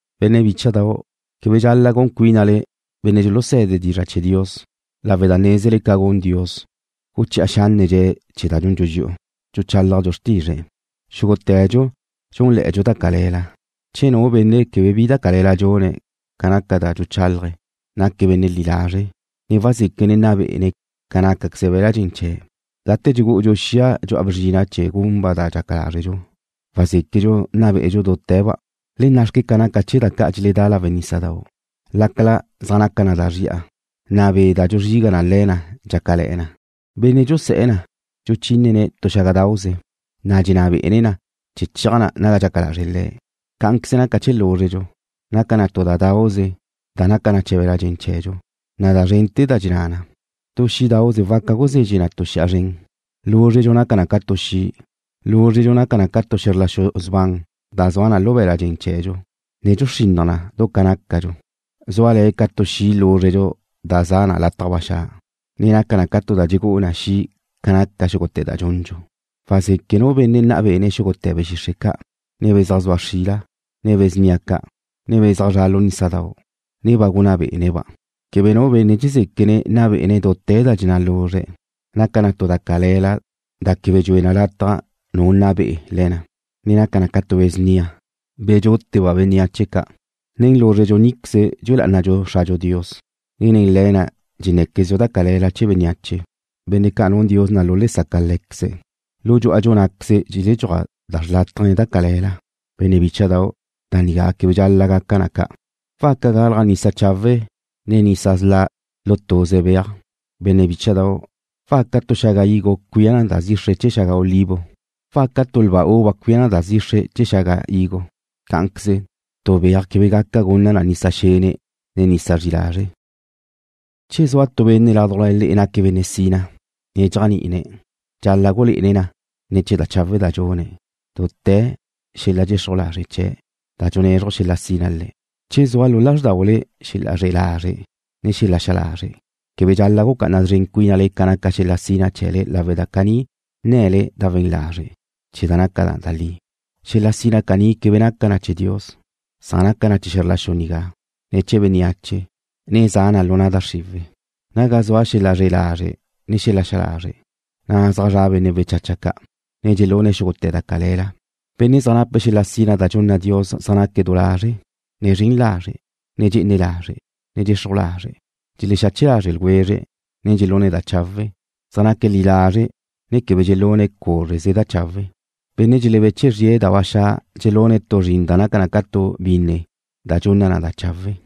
Benne' bícha'dau', quebe dxal-la' gun cuínale benne' dxuluse̱de dizra' chee̱ Dios, lawe' da nézele ca gun Dios, guchi'a xánnedxe̱' chee̱ da dxundxu dxi'u, dxuchálajdxu xrtizre̱'. Xúgute̱dxu dxúnle̱'e̱dxu da cale̱la. Che nu benne' quebe bi da cale̱la dxune̱' ca naca da dxuchálaje̱', naque̱' benne' li lazre', na' wazéquene̱' nna be'ene̱' ca nácaqueze be̱la' dxen chee̱'. Gate dxugú'udxu xia dxu'a bzrina' chee̱ gunba' da dxaca lazrdxu, wazéquedxu nna be'edxu dute̱ba'. Le na' xque ca naca chee̱ da ca' dxeledán lawe' nísadau'. Lácala zaj naca na da zri'a, na' be' da dxuzriga na le̱ na dxácale̱'e̱ na, benne' dxusé̱'e̱ na dxuchínene̱' tu xágadauze, na' dxenná be'ene̱' na chee̱ cheaj na naga dxaca lazre' le̱'. Cá'anqueze naca chee̱ lúzredxu. Naca na tu da dauze da naca chee̱ be̱la' dxen chee̱dxu, na' da zrente̱ da dxenná na. Tu xí'dauze waca guzezxe na tu xi'a zren. Lúzredxu naca na ca tu xi'. Lúzredxu naca na ca tu xe̱zr la xu sban da zua lu be̱la' dxen chee̱dxu, ne dxuxrinnaj na du ca nácadxu. Zúale̱ ca tu xi' lúzredxu da za' lataj ba xa', ne naca na ca tu da dxegú'u na xi' ca naca xúgute̱ da dxundxu. Wazeque' nu benne' nna bé'ene̱' xúgute̱ be̱ xixre' ca', ne be̱ zaj zua xrila, ne be̱ snia ca', ne be̱ zaj zra' lu nísadau', ne ba gunná bé'ene̱'-ba'. Quebe nu benne' dxezéquene̱' nna bé'ene̱' dute̱ da dxenná luzre̱'. Naca na tu da cale̱la da quebe dxue na lataj nu nna be'e le̱ na, ne naca na ca tu be̱ snia, be̱ dxúteba' bénneache ca'. Nen lúzredxu níqueze dxue lá'anadxu Xradxu Dios, ne nen le̱ na dxenné̱quezdxu da cale̱la chee̱ bénneache, benne' ca' nun Dios na' lu'a le saca Lé̱queze̱'. Lu dxú'adxu ná'queze dxeledxúaj da xrlátaje ne da cale̱la. Benne' bícha'dau', da nigá quebe dxal-la' gaca na ca'. ¿Waca galaj nisa chawe' ne nisa sla' lu tuze beaj? Benne' bícha'dau', ¿waca tu xaga higo cuía na da zixre chee̱ xaga olivo? ¿Waca tu lba uva cuía na da zixre chee̱ xaga higo? Cá'anqueze, tu beaj quebe gaca gunna na nisa xene', ne nisa zri lazre'. Che zua tu benne' ládujla le'e naque̱' benne' sina, ne dxéajni'ine̱', dxal-la' gulé'ene̱' na ne̱ chee̱ da chawe' da dxune̱' dute̱ xel-la' dxexruj lazre' chee̱' da dxunezruj xel-la' sina le̱'. Che zua lu lázrdaule xel-la' zre'e lazre' ne xel-la' xa lazre', quebe dxal-la' gucá'ana szren cuínale ca naca xel-la' sina chee̱le lawe' da caní nne̱le da we̱n lazre' chee̱ da naca da li. Xel-la' sina caní quebe naca na chee̱ Dios. Naca na chee̱ xe̱zr la xu nigá, ne chee̱ bénneache, ne za na lu na' da xriwe̱'. Naga zua xel-la' zre'e lazre' ne xel-la' xa lazre', na' zaj zra' benne' wechacha ca', ne dxelune̱' xúgute̱ da cale̱la. Benne' zaj nape̱' xel-la' sina da dxunna Dios zaj naque̱' du lazre', ne zren lazre', ne dxe'ene lazre', ne dxexruj lazre'. Dxelexache lazre' ljwezre̱', ne dxelune̱' da chawe'. Zaj naque̱' li lazre' ne quebe dxelune̱' cúzreze da chawe'. Benne' dxelebeche zrie̱' da ba xa' dxelune̱' tu zrin da naca ca tu binne da dxunna na da chawe'.